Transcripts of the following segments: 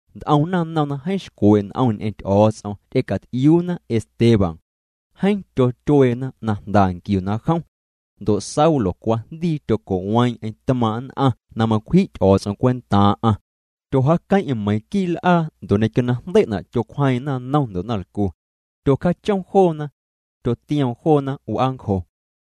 Nt'om naⁿnom na jeeⁿ xcwee' n'om ñ'eⁿ Ty'o̱o̱ts'om ty'ecat'iuuna Esteban. Jeeⁿ tyotyueena na jnda nquiuna jom. Ndo' Saulo cwajndii tyoco'weeⁿ'eⁿ tmaaⁿ' nn'aⁿ na macwji' Ty'o̱o̱ts'om cwentaaⁿ'aⁿ. Tyojaaqueⁿ'eⁿ meiⁿ quii' l'aa ndo' ñequio na jndei'na' tyocwjeeⁿ'eⁿ naⁿnom ndo' naⁿlcu. Tyocjaachom joona. Tyotioom joona w'aancjo.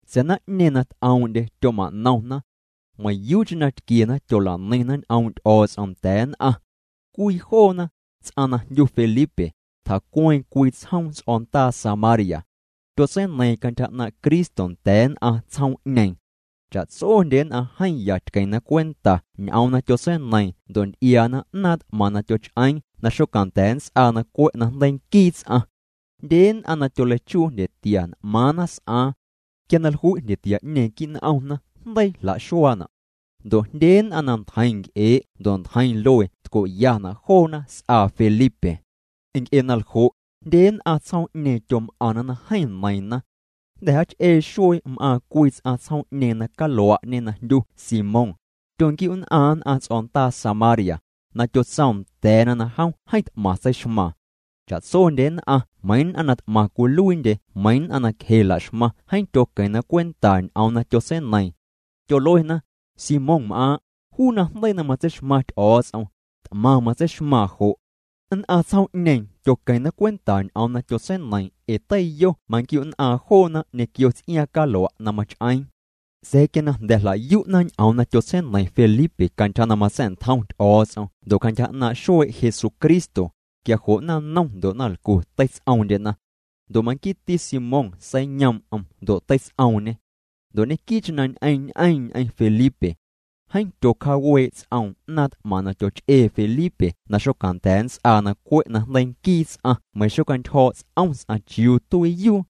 Sa̱a̱ naⁿ'ñeeⁿ na t'oom'ndye tyoma'nomna. Meiⁿyuucheⁿ na tquiena tyola'neiⁿna ñ'oom' Ty'o̱o̱ts'om nda̱a̱ nn'aⁿ. Cwii joona, ts'aⁿ na jndyu Felipe, tjacueeⁿ cwii tsjoom ts'o̱ndaa Samaria. Tyotseineiiⁿ cantyja 'naaⁿ' Cristo nda̱a̱ nn'aⁿ tsjoom'ñeeⁿ. Cha'tsondye nn'aⁿ jeeⁿ ya tqueⁿna cwenta ñ'oom na tyotseineiiⁿ ndo' nty'iaana 'naaⁿ t'maⁿ na tyoch'eeⁿ na xocanda̱a̱ nnts'aa na cwe' najndeii nquii ts'aⁿ. Jndye nn'aⁿ na tyoleichuu jndyetia n'maaⁿna s'aaⁿ. Quia na jlui' jndyetia'ñeeⁿ quii' n'omna jndeii jla'xuaana'. Ndo' jndye nn'aⁿ na ntjeiⁿ nc'ee' ndo' ntjeiⁿ luee tco'yana' joona s'aa Felipe. Nc'e na ljo', jndye nn'aⁿ tsjoom'ñeeⁿ tyom'aⁿna na jeeⁿ neiiⁿna. Jnda̱ jaach'ee xuee m'aaⁿ cwii ts'aⁿ tsjoom'ñeeⁿ na calua'ñe na jndyu Simón. Tyonquiu'nn'aaⁿ nn'aⁿ ts'o̱ndaa Samaria, na tyotsoom nda̱a̱na na jom jeeⁿ t'maⁿ tseixmaaⁿ. Cha'tsondye nn'aⁿ meiiⁿ nn'aⁿ na t'maⁿ cwiluiindye meiiⁿ nn'aⁿ na cje laxmaⁿ jeeⁿ tyoqueⁿna cwenta ñ'oom na tyotseineiiⁿ. Tyoluena: —Simónm'aaⁿ', juu najndeii na matseixmaⁿ Ty'o̱o̱ts'om, t'maⁿ matseixmaaⁿ jo'. Nn'aⁿ tsjoom'ñeeⁿ tyoqueⁿna cwenta ñ'oom na tyotseineiiⁿ ee teiyo manquiu'nn'aaⁿ joona ñequio ts'iaaⁿ calua' na mach'eeⁿ. Sa̱a̱ quia na jnda̱ jla'yu'na ñ'oom na tyotseineiⁿ Felipe cantyja na matsa̱'ntjom Ty'o̱o̱ts'om ndo' cantyja 'naaⁿ' xuee' Jesucristo, quia jo' naⁿnom ndo' naⁿlcu teits'oomndyena. Ndo' manquiiti Simón seiyoom'm ndo' teits'oomñê. Ndo' ñequii'cheⁿ na ñ'eⁿñ'eeⁿ ñ'eⁿ Felipe. Jeeⁿ tyocjaawee' ts'oom 'naaⁿ t'maⁿ na tyoch'ee Felipe na xocanda̱a̱ nnts'aa na cwe' najndeii nquii ts'aⁿ meiⁿ xocjaantyjo̱o̱' ts'om ts'aⁿ chiuu tuiiyuu.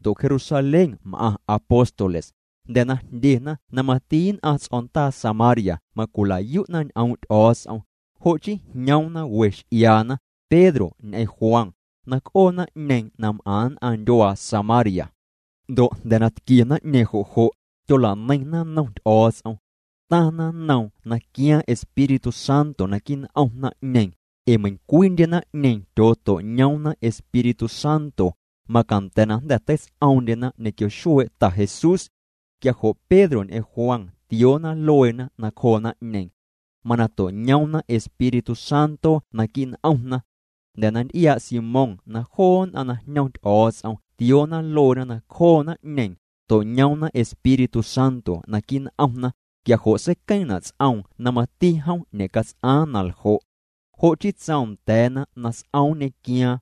Ndo' Jerusalén m'aⁿ apóstoles, jnda̱ na jndyena na mati nn'aⁿ ts'o̱ndaa Samaria macwila'yu'na ñ'oom' Ty'o̱o̱ts'om, jo' chii jñoomna we x'iaana, Pedro ñ'eⁿ Juan, na c'oo naⁿ'ñeeⁿ na m'aⁿ nn'aⁿ ndyuaa Samaria. Ndo' jnda̱ na tquie naⁿ'ñeeⁿ jo' jo', tyola'neiⁿna nnom Ty'o̱o̱ts'om. Taⁿna nnoom na quiaaⁿ Espíritu Santo naquii' n'om naⁿ'ñeeⁿ. Ee meiⁿcwiindye naⁿ'ñeeⁿ tyooto'ñoomna Espíritu Santo, macanda̱ na jnda̱ teits'oomndyena ñequio xuee' Ta Jesús. Quia jo' Pedro ñ'eⁿ Juan tioona lueena nacjoo naⁿ'ñeeⁿ. Mana to'ñoomna Espíritu Santo naquii' n'omna. Jnda̱ na nty'iaa' Simón na joo nn'aⁿ na jñom Ty'o̱o̱ts'om tioona lueena nacjoo naⁿ'ñeeⁿ, to'ñoomna Espíritu Santo naquii' n'omna, quia jo' seiqueeⁿna' ts'oom na mati jom ñe'cats'aaⁿ na ljo'. Jo' chii tsoom nda̱a̱na na s'om nñequiaaⁿ.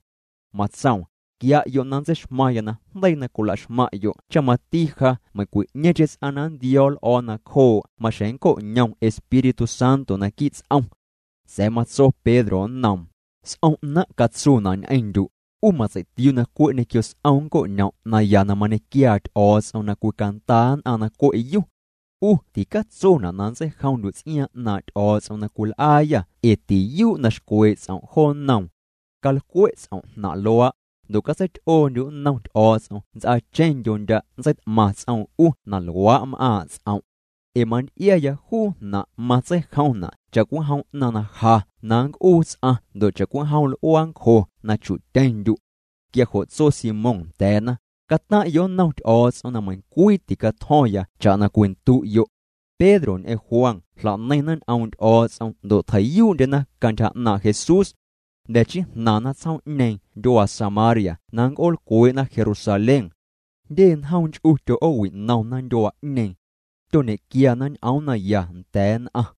Matsoom: —Quia'yo' na ntseixmaⁿya najndeii na cwilaxmaⁿ'yo' cha mati ja meiⁿcwi'ñeeⁿcheⁿ ts'aⁿ na nntio̱o̱ l'o̱o̱ nacjoo' maxjeⁿ nnco'ñom Espíritu Santo naquii' ts'om. Sa̱a̱ matso Pedro nnoom: —S'om 'naⁿ' catsuuna' ñ'eⁿndyu', 'u matsei'tiuu' na cwe' ñequio s'om nncoñom' naya na mañequiaa Ty'o̱o̱ts'om na cwicandaa nn'aⁿ na cwe'yu. 'U ticatsona' na nntseijomndyu' ts'iaaⁿ 'naaⁿ' Ty'o̱o̱ts'om na cwil'aayâ ee tiyuu' na xcwee' ts'om' jo nnoom. Calcwe' ts'om' jnaⁿ' luaa', ndo' catseity'oondyu' nnom Ty'o̱o̱ts'om nts'aacheⁿndyo ndya' nntseit'maⁿ ts'oom 'u na luaa' m'aaⁿ' ts'om'. Ee manty'iaya juu jnaⁿ' matseijomna' cha'cwijom 'naⁿ ja na nnc'uu ts'aⁿ ndo' cha'cwijom l'uaancjo na chu'tyeⁿndyu'. Quia jo' tso Simón nda̱a̱na: —Cataⁿ'yo' nnom Ty'o̱o̱ts'om na meiⁿcwii ticatjo̱ⁿya cha'na cwindu'yo'. Pedro ñ'eⁿ Juan jla'neiⁿna ñ'oom' Ty'o̱o̱ts'om ndo' tjei'yuu'ndyena cantyja 'naaⁿ' Jesús. Jnda̱ chii jnaⁿna tsjoom'ñeeⁿ ndyuaa Samaria na nnc'oolcwee'na Jerusalén. Jndye njoom nch'u tyo'oowi'nomna ndyuaa'ñeeⁿ. Tyoñequiana ñ'oom naya nda̱a̱ nn'aⁿ.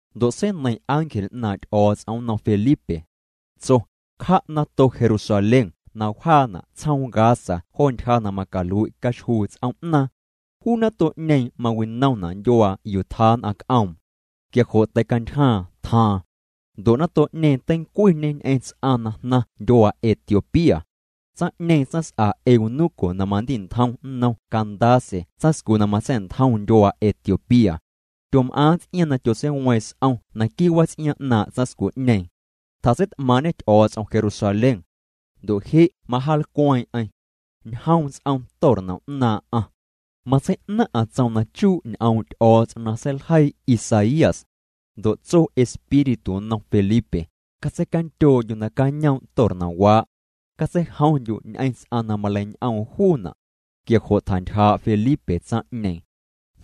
Ndo' seineiⁿ ángel 'naaⁿ' Ty'o̱o̱ts'om nnom Felipe. Tso: “Cja' nato Jerusalén na wjaana' tsjoom Gaza jo ntyja na macalui' caxjuu tsoom'naaⁿ.” Juu nato'ñeeⁿ mawinomna' ndyuaa yuu tjaa nn'aⁿ c'oom. Quia jo' teicantyjaaⁿ tjaaⁿ. Ndo' nato'ñeeⁿ teincwiñê ñ'eⁿ ts'aⁿ na jnaⁿ ndyuaa Etiopía. Tsaⁿ'ñeeⁿ tsaⁿs'a eunuco na mandi'ntjom nnom Candace tsaⁿscu na matsa̱'ntjom ndyuaa Etiopía. Tyom'aaⁿ ts'iaaⁿ na tyotseiweeⁿ s'om naquii' wats'iaaⁿ 'naaⁿ' tsaⁿscu'ñeeⁿ. Tjatseit'maaⁿ'ñê Ty'o̱o̱ts'om Jerusalén. Ndo' je' majaalcweeⁿ'eⁿ. Ñjoom ts'om tornom 'naaⁿ'aⁿ. Matsei'naⁿ'aⁿ tsom na chuu' ñ'oom' Ty'o̱o̱ts'om na seiljeii Isaías. Ndo' tso Espíritu nnom Felipe: —Catseicandyoo'ndyu' nacañoom' tornomwaa'. Catseijomndyu' ñ'eⁿ ts'aⁿ na maleiñ'oom juuna'. Quia jo' tjantyjaa' Felipe tsaⁿ'ñeeⁿ.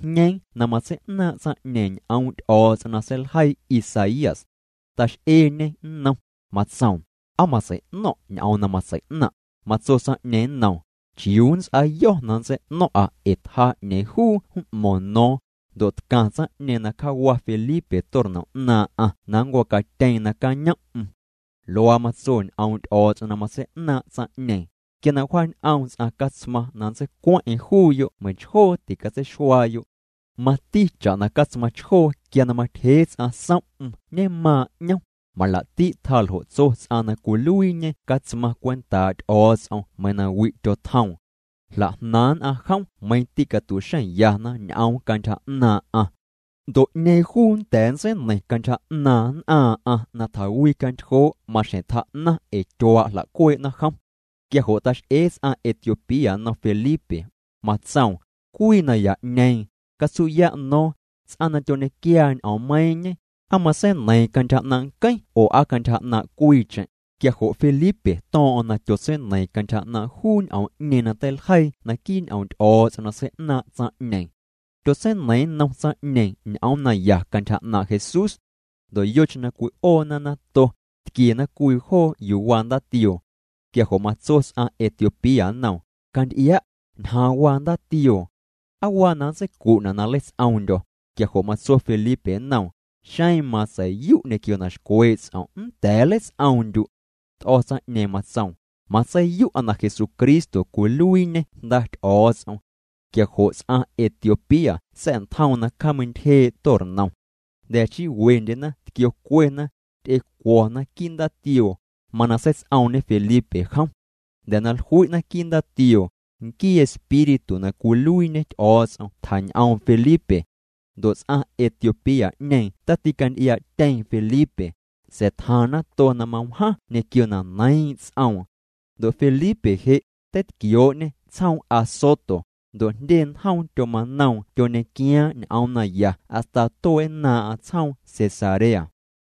Jñeeⁿ na matsei'naaⁿ' tsaⁿ'ñeeⁿ ñ'oom' Ty'o̱o̱ts'om na seiljeii Isaías. Tax'eeñê nnom, matsoom: —¿Aa matsei'no̱ⁿ' ñ'oom na matsei'naⁿ'? Matso tsaⁿ'ñeeⁿ nnoom: —¿Chiuu nnts'aayo̱ na nntsei'no̱ⁿ'a ee tjaa 'ñeeⁿ juu m'mo̱ⁿ no̱o̱ⁿ? Ndo' tcaⁿ tsaⁿ'ñeeⁿ na cjawa Felipe tornom 'naaⁿ'aⁿ na nncwacatyeeⁿ na cañoom'm. Luaa matso ñ'oom' Ty'o̱o̱ts'om na matsei'naaⁿ' tsaⁿ'ñeeⁿ: Quia na wjaañ'oom ts'aⁿ catsmaⁿ na nntseicueⁿ'eⁿ juuyo' meiⁿchjoo ticatseixuaayo'. Mati cha'na catsmaⁿ chjoo quia na matyjee ts'aⁿ som'm ñemaaⁿ' 'ñom, malaa'ti' tjaa ljo' tso ts'aⁿ na cwiluiiñe catsmaⁿ cwentaa' Ty'o̱o̱ts'om meiiⁿ na wi' tyotjoom. Jla'jnaaⁿ' nn'aⁿ jom meiⁿ tîcatu'xeⁿyana ñ'oom cantyja 'naaⁿ'aⁿ. Ndo' 'ñeeⁿ juu nnda̱a̱ nntseineiⁿ cantyja 'naaⁿ nn'aaⁿ'aⁿ na tjawicantyjoo', maxjeⁿ tjaa'naⁿ ee tyuaa' jla'cuee'na jom. Quia jo' tax'ee ts'aⁿ Etiopía nnom Felipe, matsoom: —Cwii naya'ñeeⁿ, catsu'ya' no̱o̱ⁿ, ts'aⁿ na tyoñequiaa ñ'oommeiiⁿñe ¿aa matseineiiⁿ cantyja 'naaⁿ' nqueⁿ oo aa cantyja 'naaⁿ' cwiicheⁿ? Quia jo' Felipe to̱o̱ⁿ'o̱ⁿ na tyotseineiiⁿ cantyja 'naaⁿ' juu ñ'oom'ñeeⁿ na teiljeii naquii' ñ'oom' Ty'o̱o̱ts'om na sei'naaⁿ' tsaⁿ'ñeeⁿ. Tyotseineiiⁿ nnom tsaⁿ'ñeeⁿ ñ'oom naya cantyja 'naaⁿ' Jesús. Ndo' yocheⁿ na cwi'oona nato, tquiena cwii joo yuu waa ndaatioo. Quia jo' matso ts'aⁿ Etiopía nnoom: —Canty'ia', ñjaaⁿ waa ndaatioo. ¿Aa waa na nntseicu'na' na nnleits'oomndyo̱? Quia jo' matso Felipe nnoom: —Xeⁿ matsei'yu' ñequio na xcwee' ts'om' nnda̱a̱ nleits'oomndyu'. T'o̱ tsaⁿ'ñeeⁿ matsoom: —Matseiyu'a na Jesucristo cwiluiiñê Jnda Ty'o̱o̱ts'om. Quia jo' ts'aⁿ Etiopía sa̱'ntjoom na cjaameintyjee' tornom. Jnda̱ chii wendyena tquiocuena, ty'ecuo̱na quii' ndaatioo, mana seits'oomñe Felipe jom. Jnda̱ na jlui'na quii' ndaatioo, nquii Espíritu na cwiluiiñe Ty'o̱o̱ts'om tjañ'oom Felipe. Ndo' ts'aⁿ Etiopía'ñeeⁿ taticanty'iaa'tyeeⁿ Felipe, sa̱a̱ tjaaⁿ nato na mawjaⁿ ñequio na neiiⁿ' ts'oom. Ndo' Felipe je', teitquioo'ñê tsjoom Azoto, ndo' jndye njoom tyomanoom tyoñequiaaⁿ ñ'oom naya hasta tuee'nnaaⁿ'aⁿ tsjoom Cesarea.